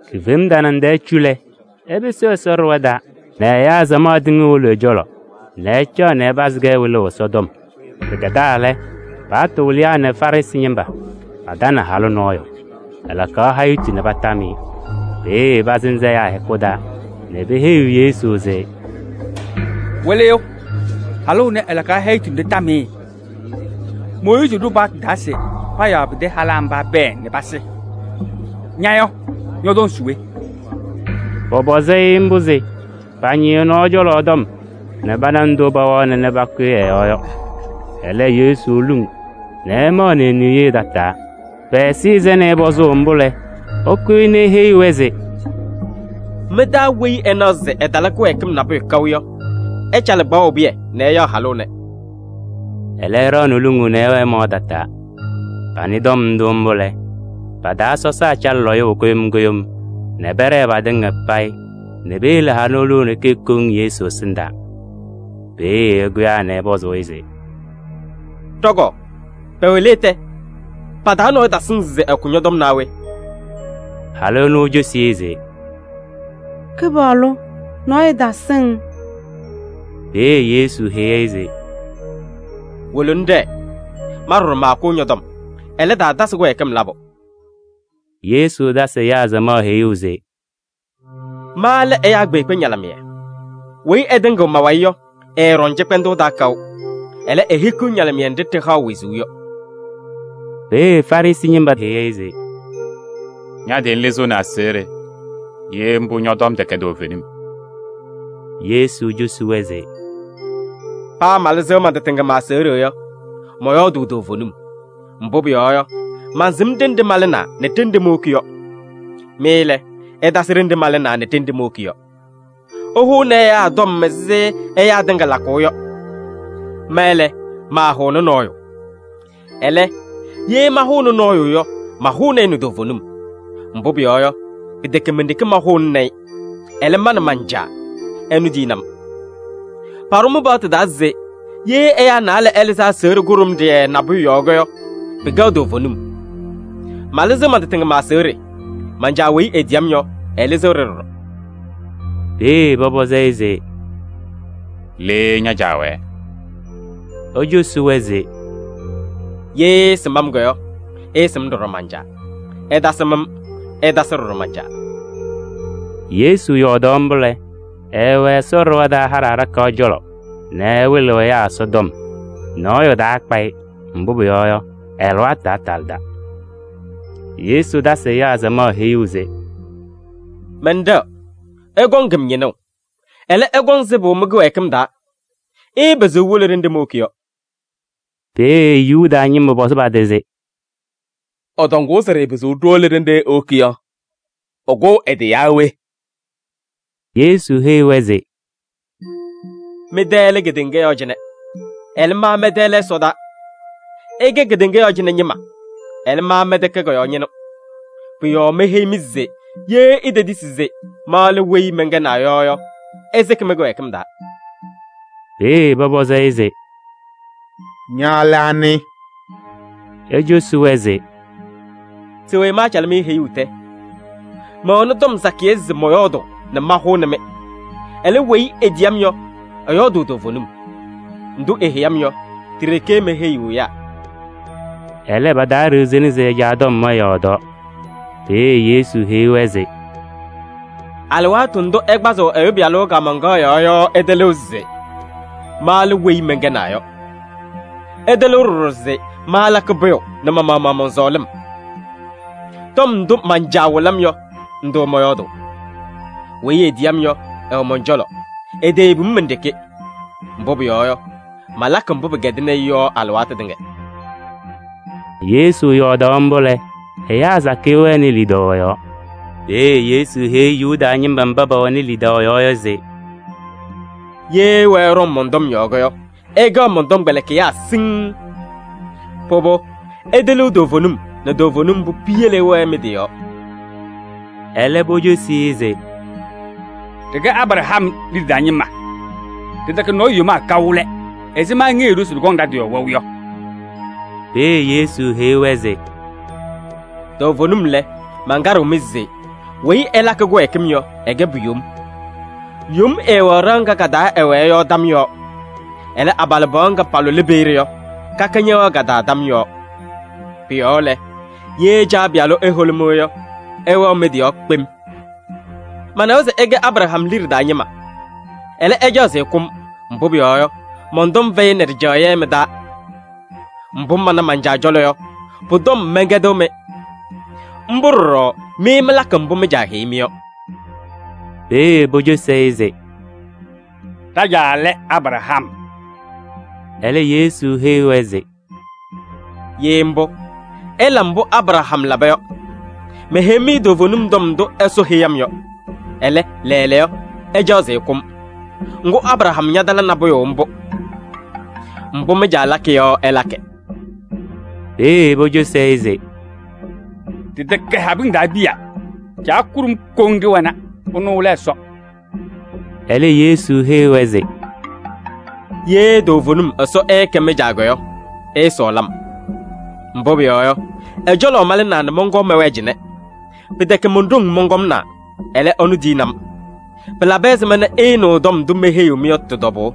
Kifem tanaŋ tɛɛ cu lɛ, ɛpɩsɩ Ɛsɔ ɖɩɣa taa nɛ ɛyaa samaɣ tɩŋa wolo ɛ-cɔlɔ nɛ ɛcaɣ nɛ ɛpazɩ-kɛ wɩlʋʋ Ɛsɔtɔm. Pɩkɛdaa lɛ, Paɣtʋ wɩlɩyaa nɛ Farɩsɩ ñɩma patanɩ halʋ nɔɔyʋ. Ɛlakaɣ hayitu nɛ patam-ɩ. Peeye pasɩnzɩ-ɩ ɛyaa hɛkʋ taa nɛ peheyi Yesu se: “Wɩlɩyʋ! Halʋ ɛnɛ, ɛlakaɣ hayitu nɛ ɖɩtam-ɩ. Mooyiizi ɖʋ paɣtʋ taa se payaɣ pɩtɛ halaa mba pɛɛ nɛ pasɩ. Ña yɔ, ñɔtɔŋ se we?” Pɔpɔzɩ-ɩ mbʋ se pañɩ ɛ-nɔɔ cɔlɔ tɔm nɛ pana ndʋ paawana nɛ pakʋyɩ ɛ-yɔɔ yɔ. Ɛlɛ, Yesu luŋ nɛ ɛmaɣnɩ e-niye tataa. Pɛ-ɛzɩyɛ sɛnɩ pɔzʋʋ mbʋ lɛ, ɛkʋyɩ nɛ eheyi-wɛ se: “Mɩ-taa weyi ɛnaɣ se ɛtala kɩwɛɛkɩm nabʋyʋ kaʋ yɔ, ɛcalɩ kpaɣʋ pɩyɛ nɛ ɛyaɣ halʋ ɛnɛ.” Ɛlɛ ɛɖaɣnɩ luŋuu nɛ ɛwɛɛ ɛmaɣ tataa. Panɩ tɔm ndʋ mbʋ lɛ, pa-taa sɔsaa calɩ lɔyʋʋ kʋɖʋm kʋɖʋm nɛ pɛɖɛɛ patɩŋa payɩ nɛ piyele halʋ ɛnʋ e-ɖeke koŋ Yesu ɛsɩndaa. Peeye ɛkʋyaa nɛ ɛpɔzɩ-ɩ se: “Ɖɔ-kɔɔ, pɛwɛ le tɛ? Pa-taa nɔɔyʋ tasɩŋ se ɛkʋ ñɔ-tɔm naa we?” Halʋ ɛnʋ ecosi-i se: “Kɩpaɣlʋ! Nɔɔyʋ tasɩŋ.” Peeye Yesu heyi-i se: “Wolo ŋɖɛɛ, ma ɖɔɖɔ maakʋʋ ñɔ-tɔm. Ɛlɛ, taatasɩ kɩwɛɛkɩm labʋ.”] Yesu tasɩ ɛyaa samaɣ heyuu se: “Ma lɛ ɛyaa kpeekpe ñalɩmɩyɛ. Weyi ɛtɩŋɩɣ ma-wayɩ yɔ, ɛɛɖɔŋ cɩkpɛndʋʋ taa kaʋ. Ɛlɛ, ehikiɣ ñalɩmɩyɛ nɖɩ ɖɩhaɣ wezuu yɔ.” Peeye Farɩsɩ ñɩma heyi-i se: “Ña-tɩ ŋlɩzɩɣnɩ ña-aseɣɖe! Ye mbʋ, ñɔ-tɔm tɛkɛ toovenim.” Yesu cosi-wɛ se: “Paa malɩzɩɣ man-tɩ tɩŋa ma-aseɣɖe yɔ, mɔyɔɔdʋʋ toovenim. Mbʋ pʋyɔɔ yɔ, mansɩm ɖenɖe malɩnaa nɛ ɖenɖe mowoki yɔ. Mɩ lɛ, ɩtasɩ ɖenɖe malɩnaa nɛ ɖenɖe mowoki yɔ. Ɩhʋʋnɩ ɛyaa tɔm ɛzɩ ɛyaa tɩŋa lakʋʋ yɔ. Ma lɛ, maahʋʋnɩ nɔɔyʋ. Ɛlɛ, ye mahʋʋnɩ nɔɔyʋ yɔ, mahʋʋnɩ-ɩ nɛ toovenim. Mbʋ pʋyɔɔ yɔ, pɩtɛkɛ men-ɖeke mahʋʋnɩnɩ-ɩ, ɛlɛ, ma nɛ man-Caa, ɛnʋ tiyini-m. Paɖʋ mɩ-paɣtʋ taa se: ye ɛyaa naalɛ ɛlɩzɩ aseɣɖe kʋɖʋmɖɩyɛ nabʋyʋ yɔɔ yɔ, pɩkɛɣ toovenim. Malɩzɩɣ man-tɩ tɩŋa ma-aseɣɖe, man-Caa weyi etiyi-m yɔ, ɛlɩzɩɣ-ɖɩ ɖɔɖɔ.” Peeye pɔpɔzɩ-ɩ se: “Le ña-Caa wɛɛ?” Ecosi-wɛ se: “Ye ɩɩsɩm-m yɔ, ɩɩsɩm ɖɔɖɔ man-Caa. Ɩtasɩm-m, ɩtasɩ ɖɔɖɔ man-Caa.” Yesu yɔɔdaɣ mbʋ lɛ, ɛɛwɛ Ɛsɔ ɖɩɣa taa haɖɛ aɖakaɣ cɔlɔ nɛ ɛwɩlɩɣ ɛyaa Ɛsɔtɔm. Nɔɔyʋ taakpa-ɩ, mbʋ pʋyɔɔ yɔ, ɛ-alɩwaatʋ taatalɩda. Yesu tasɩ ɛyaa samaɣ heyuu se: “Mɛnɖɛɣ, ɩkɔŋ-m ñɩnʋʋ. Ɛlɛ, ɩkɔŋ sɩbʋ mɩ-kɩwɛɛkɩm taa. Ɩɩpɩzɩɣ iwolo ɖenɖe mowoki yɔ.” Peeye Yuda ñɩma pɔzɩ pa-tɩ se: “Ɛtɔŋʋʋ se ɖɩɩpɩzɩɣ ɖiwolo ɖenɖe ewoki yɔ, ɛkʋʋ ɛ-tɩ yaa we?” Yesu heyi-wɛ se: “Mɩ-tɛ lɛ kedeŋa yɔɔ cɩnɛ. Ɛlɛ, ma mɛn-tɛ lɛ ɛsɔdaa. Ɩkɛ kedeŋa yɔɔ cɩnɛ ñɩma, ɛlɛ, ma mɛntɛkɛ kɔ-yɔɔ ñɩnʋ. Pʋ-yɔɔ meheyi-mɩ se ye itetisi se: ‘Ma lɛ weyi mɛnkɛnaa yɔ’ yɔ, ɩsɩkɩ mɩ-kɩwɛɛkɩm taa.” Peeye pɔpɔzɩ-ɩ se: “Ña lɛ anɩ?” Ecosi-wɛ se: “Se we maacalɩ-mɩ heyuu tɛ? Mɛwɛnɩ tɔm sakɩyɛ se mɔyɔɔdʋʋ nɛ mahʋnɩ-mɩ. Ɛlɛ, weyi etiyi-m yɔ, ɛyɔɔdʋʋ toovenim. Ndʋ eheyi-m yɔ, ti-ɖeke meheyiɣ ɛyaa.” Ɛlɛ, pataaɖiɣzini se ɛ-Caa tɔm ɛyɔɔdaɣ. Peeye Yesu heyi-wɛ se: “Alɩwaatʋ ndʋ ɩkpazɩɣ Ɛyʋ Pɩyalʋ kaamaŋkaɣ yɔɔ yɔ ɩtɩlɩɣ se: ‘Ma lɛ weyi mɛnkɛnaa yɔ.’ Ɩtɩlɩɣ ɖɔɖɔ se maalakɩ pʋyʋ nɛ ma-maɣmaɣ mɔn-sɔɔlɩm: tɔm ndʋ man-Caa wɩlɩ-m yɔ, ndʋ mɔyɔɔdʋʋ. Weyi etiyi-m yɔ, ɛwɛ mɔn-cɔlɔ, eteyebi-m men-ɖeke. Mbʋ pʋyɔɔ yɔ, malakɩ mbʋ pɩkɛdɩnɩ-ɩ yɔ alɩwaatʋ tɩŋa.” Yesu yɔɔdaɣ mbʋ lɛ, ɛyaa sakɩyɛ wɛnɩ lidaʋ ɛ-yɔɔ. Peeye Yesu heyi Yuda ñɩma mba pɛwɛnɩ lidaʋ ɛ-yɔɔ yɔ se: “Ye ɩwɛɛ ɩɖɔŋ mɔn-tɔm yɔɔ yɔ, ɩkɛɣ mɔn-tɔmkpɛlɩkɩyaa siŋŋ. Pʋbʋ, ɩtɩlɩɣ toovenim nɛ toovenim mbʋ piyele ɩwɛɛ mɩ-tɩ yɔɔ.” Ɛlɛ pocosi-i se: “Ɖɩkɛ Abraham liɖe taa ñɩma. Ɖɩtɛkɛ nɔɔyʋ yomaa kaʋ lɛ, ɛzɩma ŋheyiɣ-ɖʋ se ɖɩkɔŋ ɖa-tɩ yɔɔ wɛʋ yɔ?” Peeye Yesu heyi-wɛ se: “Toovenim lɛ, mankaɖɩɣ-mɩ se: weyi ɛlakɩ kɩwɛɛkɩm yɔ, ɛkɛ pu-yom. Yom ɛɛwɛɣ ɖɩɣa ŋga ka-taa ɛwɛɛ yɔ tam yɔɔ. Ɛlɛ, abalɩbɩɣa ŋga palʋlɩ peeye yɔ, kaka ñɛwɛɣ ka-taa tam yɔɔ. Pʋ-yɔɔ lɛ, ye Caa Pɩyalʋ eholi-mɩ yɔ, ɩwɛɣ mɩ-tɩ yɔɔ kpem. Manawa se ɩkɛ Abraham liɖe taa ñɩma. Ɛlɛ, ɩcaɣ se ɩkʋ-m, mbʋ pʋyɔɔ yɔ, mɔn-tɔm fɛyɩnɩ ɖɩjaɣyɛ mɩ-taa. Mbʋ mana man-Caa cɔlɔ yɔ, pʋ-tɔm mɛnkɛdɩɣ-mɩ. Mbʋ ɖɔɖɔ mɩ mɩlakɩ mbʋ mɩ-caa heyi-mɩ yɔ.” Peeye pocosi-i se: “Ɖa-caa lɛ Abraham.” Ɛlɛ Yesu heyi-wɛ se: “Ye mbʋ, ɩla mbʋ Abraham laba yɔ. Meheyi-mɩ toovenim tɔm ndʋ Ɛsɔ heyi-m yɔ, ɛlɛ, lɛɛlɛɛyɔ ɩcaɣ se ɩkʋ-m. Ŋgʋ, Abraham ñatala nabʋyʋ mbʋ. Mbʋ mɩ-caa lakɩ yɔ ɩlakɩ.” Peeye pocosi-i se: “Ɖɩtɛkɛ habɩŋ taa piya, Caa kʋɖʋm koŋ ɖɩwɛna, ɛnʋ lɛ Ɛsɔ.” Ɛlɛ Yesu heyi-wɛ se: “Ye toovenim Ɛsɔ ɛɛkɛ mɩ-Caa yɔ, ɩɩsɔɔlɩ-m. Mbʋ pʋyɔɔ yɔ, ɛ-cɔlɔ malɩnaa nɛ mɔnkɔɔ mɛwɛɛ cɩnɛ. Pɩtɛkɛ mon-ɖoŋ mɔnkɔmnaa, ɛlɛ, ɛnʋ tiyini-m. Pɩlabɩ ɛzɩma nɛ ɩɩnɩɣ tɔm ndʋ meheyiɣ-mɩ yɔ tɩ-tɔbʋʋ?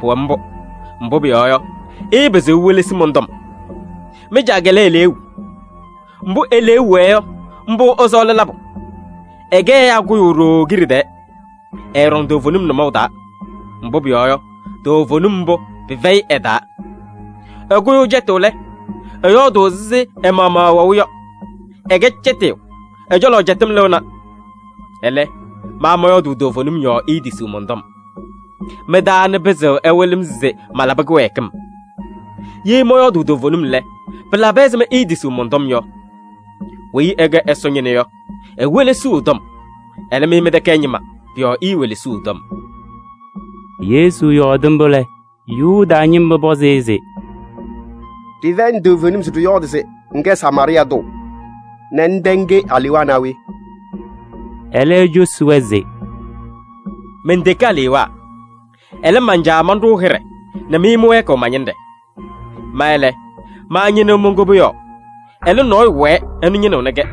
Pʋwɛ mbʋ, mbʋ pʋyɔɔ yɔ, ɩɩpɩzɩɣ iwelesi mɔn-tɔm. Mɩ-caa lɛ eleeu. Mbʋ e-liu wɛɛ yɔ, mbʋ ɩsɔɔlɩ labʋ. Ɛkɛ ɛyaa kʋyʋ ɖooo kiɖe tɛɛ. Ɛɛɖɔŋ toovenim nʋmɔʋ taa, mbʋ pʋyɔɔ yɔ, toovenim mbʋ, pɩfɛyɩ ɛ-taa. Ɛkʋyʋʋ cɛtʋʋ lɛ, ɛyɔɔdʋʋ ɛzɩ ɛ-maɣmaɣ ɛwɛʋ yɔ: ɛkɛ cɛtɩyʋ, ɛ-cɔlɔ cɛtɩm lɩɣna. Ɛlɛ, ma mɔyɔɔdʋʋ toovenim yɔɔ iitisiɣ mɔn-tɔm. Mɩ-taa anɩ pɩzɩɣ ɛwɩlɩ-m se malabɩ kɩwɛɛkɩm? Ye mɔyɔɔdʋʋ toovenim lɛ, pɩlabɩ ɛzɩma iitisiɣ mɔn-tɔm yɔ? Weyi ɛkɛ Ɛsɔ ñɩnʋ yɔ, ewelesiɣ ɛ-tɔm. Ɛlɛ, mɩ mɩtɛkɛ ɛ-ñɩma, pʋ-yɔɔ iiwelesiɣ ɛ-tɔm.” Yesu yɔɔdɩ mbʋ lɛ, Yuda ñɩma pɔzɩ-ɩ se: “Ɖɩfɛyɩnɩ toovenim se ɖɩyɔɔdɩ se ŋkɛ Samaarɩɩ tʋ nɛ ŋtɛ ŋke alewaa naa we?” Ɛlɛ ecosi-wɛ se: “Menteke alewaa, ɛlɛ, man-Caa manɖʋʋ hɩɖɛ nɛ mɩ mɩwɛɛkɩɣ ma-ñɩnɖɛ! Ma lɛ, maañɩnɩɣ mon-koboyaɣ. Ɛlɛ, nɔɔyʋ wɛɛ, ɛnʋ ñɩnɩɣnɩ-kɛ,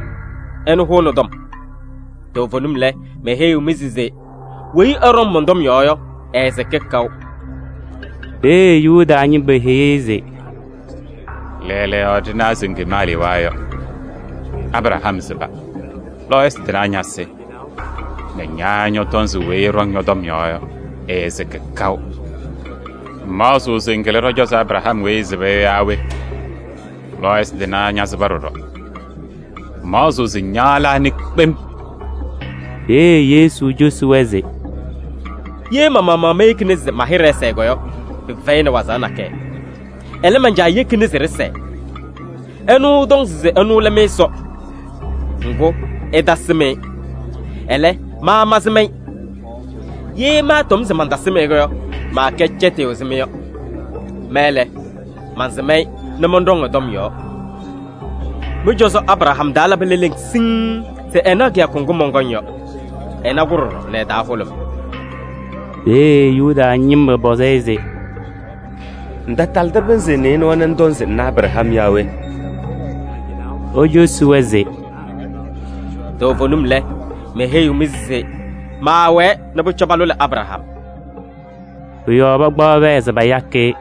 ɛnʋ hʋʋnɩ tɔm. Toovenim lɛ, meheyiɣ-mɩ se: weyi ɛɖɔŋ mɔn-tɔm yɔɔ yɔ, ɛɛsɩkɩ kaʋ.” Peeye Yuda ñɩma heyi-i se: “Lɛɛlɛɛyɔ ɖɩnawa se ŋkem alewaa yɔ! Abraham sɩba, lɔɔyɩsɩ tɩnaa ñasɩ nɛ ña ñɔtɔŋ se weyi ɛɖɔŋ ñɔ-tɔm yɔɔ yɔ, ɛɛsɩkɩ kaʋ! Ŋmaɣzɩɣ se ŋkɩlɩ ɖɔ-cɔzɔ Abraham weyi ɛsɩba yɔ yaa we? Lɔɔyɩsɩ tɩnaa ñasɩba ɖɔɖɔ, ŋmaɣzɩɣ se ña lɛ anɩ kpem?” Peeye Yesu cosi-wɛ se: “Ye ma-maɣmaɣ meyekini se ma-hɩɖɛ ɛsɛɛ yɔ, pɩfɛyɩnɩ waɣzaɣ nakɛyɛ. Ɛlɛ, man-Caa yekini se ɖɩsɛɛ. Ɛnʋ ɩtɔŋ se ɛnʋ lɛ mɩ-Ɛsɔ. Ŋgʋ, ɩtasɩm-ɩ. Ɛlɛ, ma mansɩm-ɩ. Ye maatɔm se mantasɩm-ɩ yɔ, maakɛ cɛtɩyʋ ɛzɩ mɩ yɔ. Ma lɛ, mansɩm-ɩ nɛ mɔnɖɔŋ ɛ-tɔm yɔɔ. Mɩ-cɔzɔ Abraham taa labɩ leleŋ siŋŋ se ɛnaɣ kɩyakʋ ŋgʋ mɔnkɔŋ yɔ. Ɛna-kʋ ɖɔɖɔ nɛ ɛ-taa hʋlʋmɩ.” Peeye Yuda ñɩma pɔzɩ-ɩ se: “Ŋtatalɩdɩ pɩnzɩ nɩɩnʋwa nɛ ŋtɔŋ se ŋna Abraham yaa we?” Ecosi-wɛ se: “Toovenim lɛ, meheyiɣ-mɩ se maawɛɛ nɛ pʋcɔ palʋlɩ Abraham.” Pʋ-yɔɔ pakpaɣ pɛɛ se payakɩ-ɩ.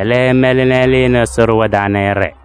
Ɛlɛ, ɛmɛlɩ nɛ ɛlɩnɩ Ɛsɔ ɖɩɣa taa nɛ ɛɖɛɛ.